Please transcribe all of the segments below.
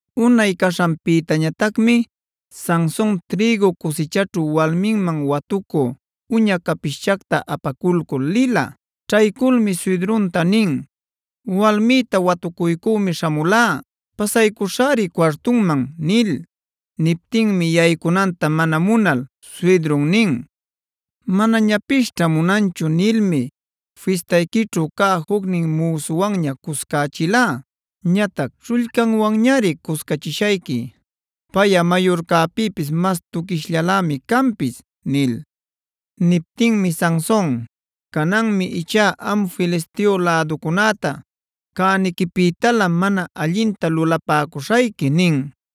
Unay caśhanpïtañatacmi Sanson trïgu cusichaćhu walminman watucü uña capischacta apaculcul lila. Ćhayculmi suydrunta nin: “Walmïta watucuycümi śhamulá. Pasaycuśhäri cuartunman” nil. Niptinmi yaycunanta mana munal suydrun nin: “Manañapisćha munanchu nilmi fistayquićhu cä jucnin müsuwanña cuscächilá. Ñatac śhullcanwanñari cuscachishayqui. Payꞌa mayurcäpïpis mas tuquishllalämi canpis” nil. Niptinmi Sanson: “Cananmi ichá am Filisteo läducunäta cäniquipïtalä mana allinta lulapäcuśhayqui” nin.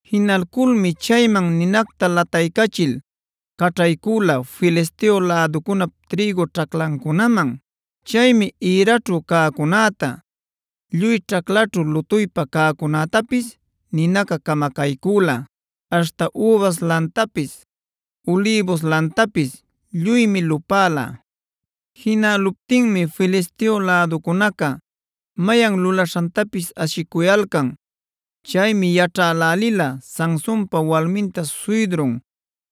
Jinalculmi chayman ninacta lataycachil caćhaycüla Filisteo läducunap trïgu ćhaclancunaman. Chaymi ïraćhu cäcunäta, lluy ćhaclaćhu lutuypa cäcunätapis ninaca camacaycüla. Aśhta übas lantapis, ulïbus lantapis lluymi lupäla. Jinäluptinmi Filisteo läducunaca mayan lulaśhantapis ashicuyalcan. Chaymi yaćhälälila Sansonpa walminta suydrun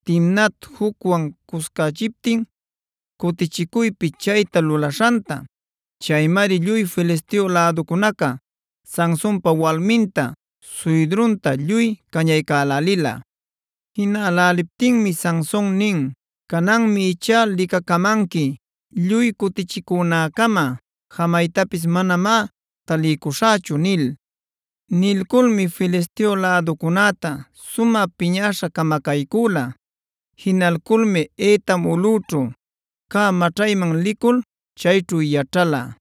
Timnat jucwan cuscächiptin, cutichicuypi chayta lulaśhanta. Chaymari lluy Filisteo läducunaca Sansonpa walminta, suydrunta lluy cañaycälälila. Jinäläliptinmi Sanson nin: “Cananmi ichá licacamanqui; lluy cutichicunäcama jamaytapis manamá taliycuśhächu” nil. Nilculmi Filisteo läducunäta sumä piñäśha camacaycüla. Jinalculmi Etam ulꞌüćhu cä maćhayman licul, chayćhu yaćhala.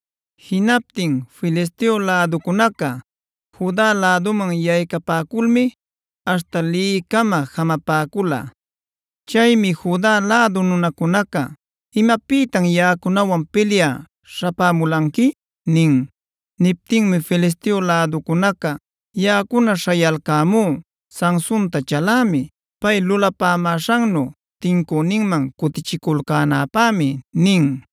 Jinaptin Filisteo läducunaca Juda läduman yaycapäculmi aśhta Lehicama jamapäcula. Chaymi Juda lädu nunacunaca: “¿Imapïtam yaꞌacunawan pilyä śhapämulanqui?” nin. Niptinmi Filisteo läducunaca: “Yaꞌacuna śhayalcämú Sansonta chalämi. Pay lulapämäśhannu tincüninman cutichiculcänäpämi” nin.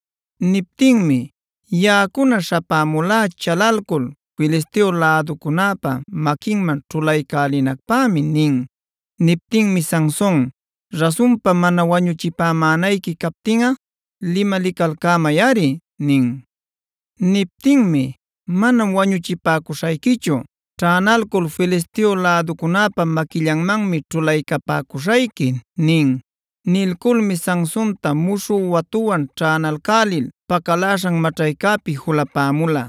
Niptinmi: “Yaꞌacuna śhapämulá chalalcul Filisteo läducunäpa maquinman ćhulaycälinacpämi” nin. Niptinmi Sanson: “Rasunpa mana wañuchipämänayqui captinꞌa limalicalcämayꞌari” nin. Niptinmi: “Manam wañuchipäcuśhayquichu, ćhänalcul Filisteo läducunäpa maquillanmanmi ćhulaycapäcuśhayqui” nin. Nilculmi Sansonta muśhü watuwan ćhänalcälil pacaläśhan maćhaycäpi julapämula.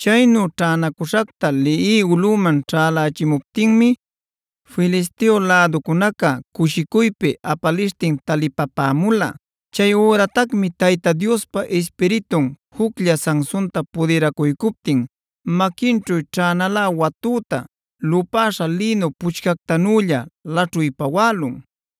Chaynu ćhänacüśhacta Lehi ulꞌüman ćhälälichimuptinmi Filisteo läducunaca cushicuypi apalishtin talipapämula. Chay üratacmi Tayta Diospa Ispiritun juclla Sansonta pudiracuycuptin maquinćhu ćhänalä watüta, lupäśha lïnu puchcactanülla laćhuy päwälun.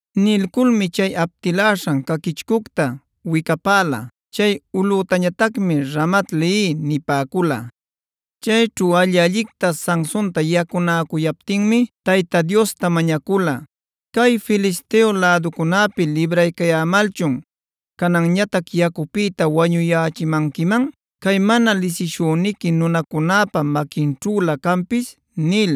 Nilculmi chay aptiläśhan caquichcucta wicapäla. Chay ulꞌütañatacmi Ramat-lehia nipäcula. Chayćhu alli-allicta Sansonta yacunäcuyaptinmi Tayta Diosta mañacula: “¿Cay Filisteo läducunäpi libraycayämalchun, cananñatac yacupïta wañuyächimanquiman cay mana lisishüniqui nunacunäpa maquinćhülä canpis?” nil.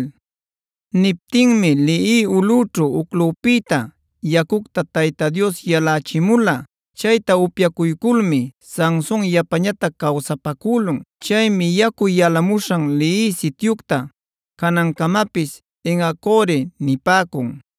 Niptinmi Lehi ulꞌućhu uclupïta yacucta Tayta Dios yalächimula. Chayta upyacuyculmi Sanson yapañatac cawsapacülun. Chaymi yacu yalamuśhan Lehi sityucta canancamapis En-hacoreb nipäcun.